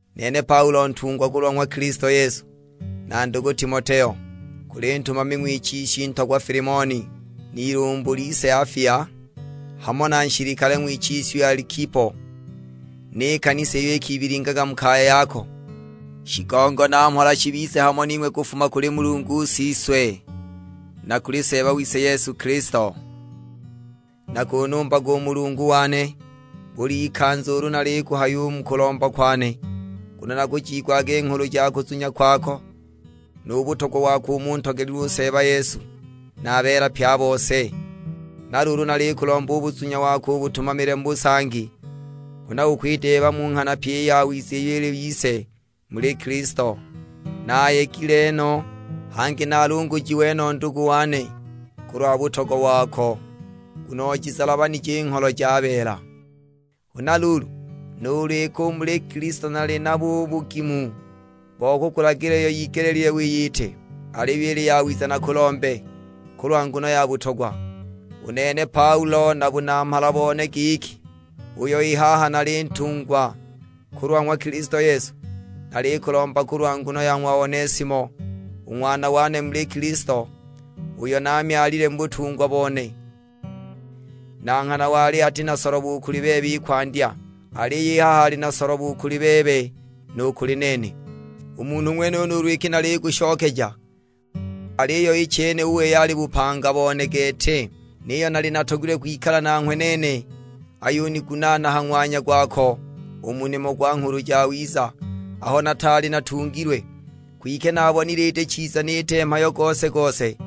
Nene Paulo ntungwa kulwa ng'wa Kilisto Yesu, na ndugu Timoteo. Kuli ntumami ng'wichiswi ntogwa Filimoni, n'ilumbu lise Afia, hamo na nshilikale ng'wichiswi Alikipo; ni kanisa iyo ikibilingaga mu kaya yako. Shigongo na mhola shibize hamo ning'we kufuma kuli Mulungu Siswe, na kuli Seeba wise Yesu Kilisto. Nakunumbaga u Mulungu wane, bul'ikanza ulu nalikuhaya u mu kulomba kwane. Nguno nakujiigwaga i nghulu ja kuzunya kwako, nu butogwa wako umo untogelilwe u Seeba Yesu, na a beela pye a bose. Na luulu nalikulomba u buzunya wako ubutumamile mu busangi, huna ukwideeba mu nghana pyi i yawiza iyo ili yise muli Kilisto. Naayegile no, hangi naalungujiwe no ndugu wane, kulwa butogwa wako; nguno ojizalabanije i ngholo ja beela. Huna luulu, nuulu iki u muli Kilisto nali nabo u bugimu bo kukulagila iyo yigelile wiyite, aliyo ili yawiza nakulombe, kulwa nguno ya butogwa. U nene Paulo na bunamhala bone giki, uyo i haha nali ntungwa kulwa ng'wa Kilisto Yesu. Nalikulomba kulwa nguno ya ng'wa Onesimo, u ng'wana wane muli Kilisto; uyo naamyalile mu butungwa bone. Na nghana wali ati na solobo u kuli bebe i kwandya; aliyo i haha ali na solobo u kuli bebe nu kuli nene. U munhu ng'wenuyo nuulu iki nalikushokeja; aliyo i chene u wei ali bupanga bone gete. Niyo naali natogilwe kwikala nanghwe nene, ayunigunaana ha ng'wanya gwako u mu nimo gwa Nghulu Jawiza, aho nataali natungilwe. Kwike naabonile iti chiza niite mhayo gose-gose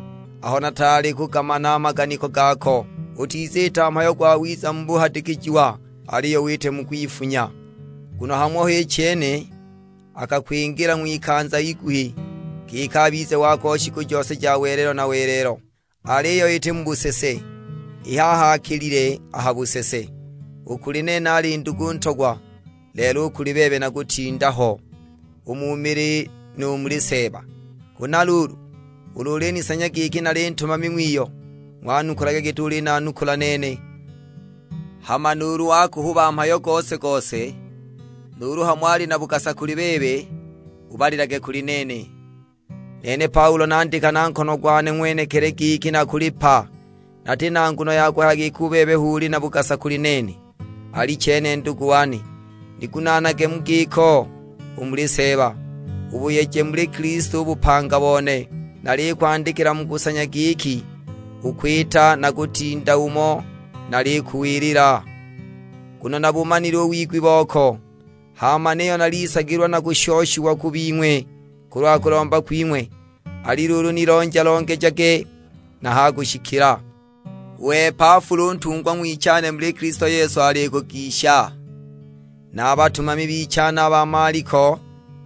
aho nataali kugamana a maganiko gako; utiziita mhayo gwawiza mu buhadikijiwa, aliyo wite mu kwifunya. Nguno hamo h'i chene akakwingila ng'wikanza iguhi, giki abize wako shiku jose ja welelo na welelo; aliyo iti mu busese. I haha akilile a ha busese; u kuli nene ali ndugu ntogwa, lelo u kuli bebe na kutinda ho: u mu mili nu muli Seeba! Huna luulu, ulu ulinisanya giki nali ntumami ng'wiyo, ng'wanukulage giti ulinanukula nene. Hama nuulu wakuhuba mhayo gose-gose, nuulu hamo ali na bugasa kuli bebe, bubalilage kuli nene. Nene Paulo nandika na nkono gwane ng'wenekili giki nakulipa, nati na nguno ya kuhaya giki u bebe hu uli na bugasa u kuli nene. Alichene ndugu wane, nigunaanage mu giko u muli Seeba, ubuyeje muli Kilisto u bupanga bone. Nalikwandikila mu kusanya giki ukwita na kutinda umo nalikuwilila, nguno nabumanile u wigwi boko. Hama niyo nalisagilwa nakushoshiwa ku bing'we kulwa kulomba kwing'we; ali luulu, nilonja-longejage na ha kushikila. U Epafula u ntungwa ng'wichane muli Kilisto Yesu alikugisha, na a batumami bichane a ba Maliko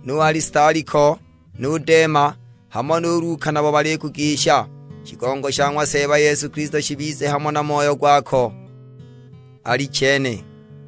nu Alistako nu Dema, hamo nu Luka, nabo balikugisha. Shigongo sha ng'wa Seeba Yesu Kilisto shibize hamo na moyo gwako: Alichene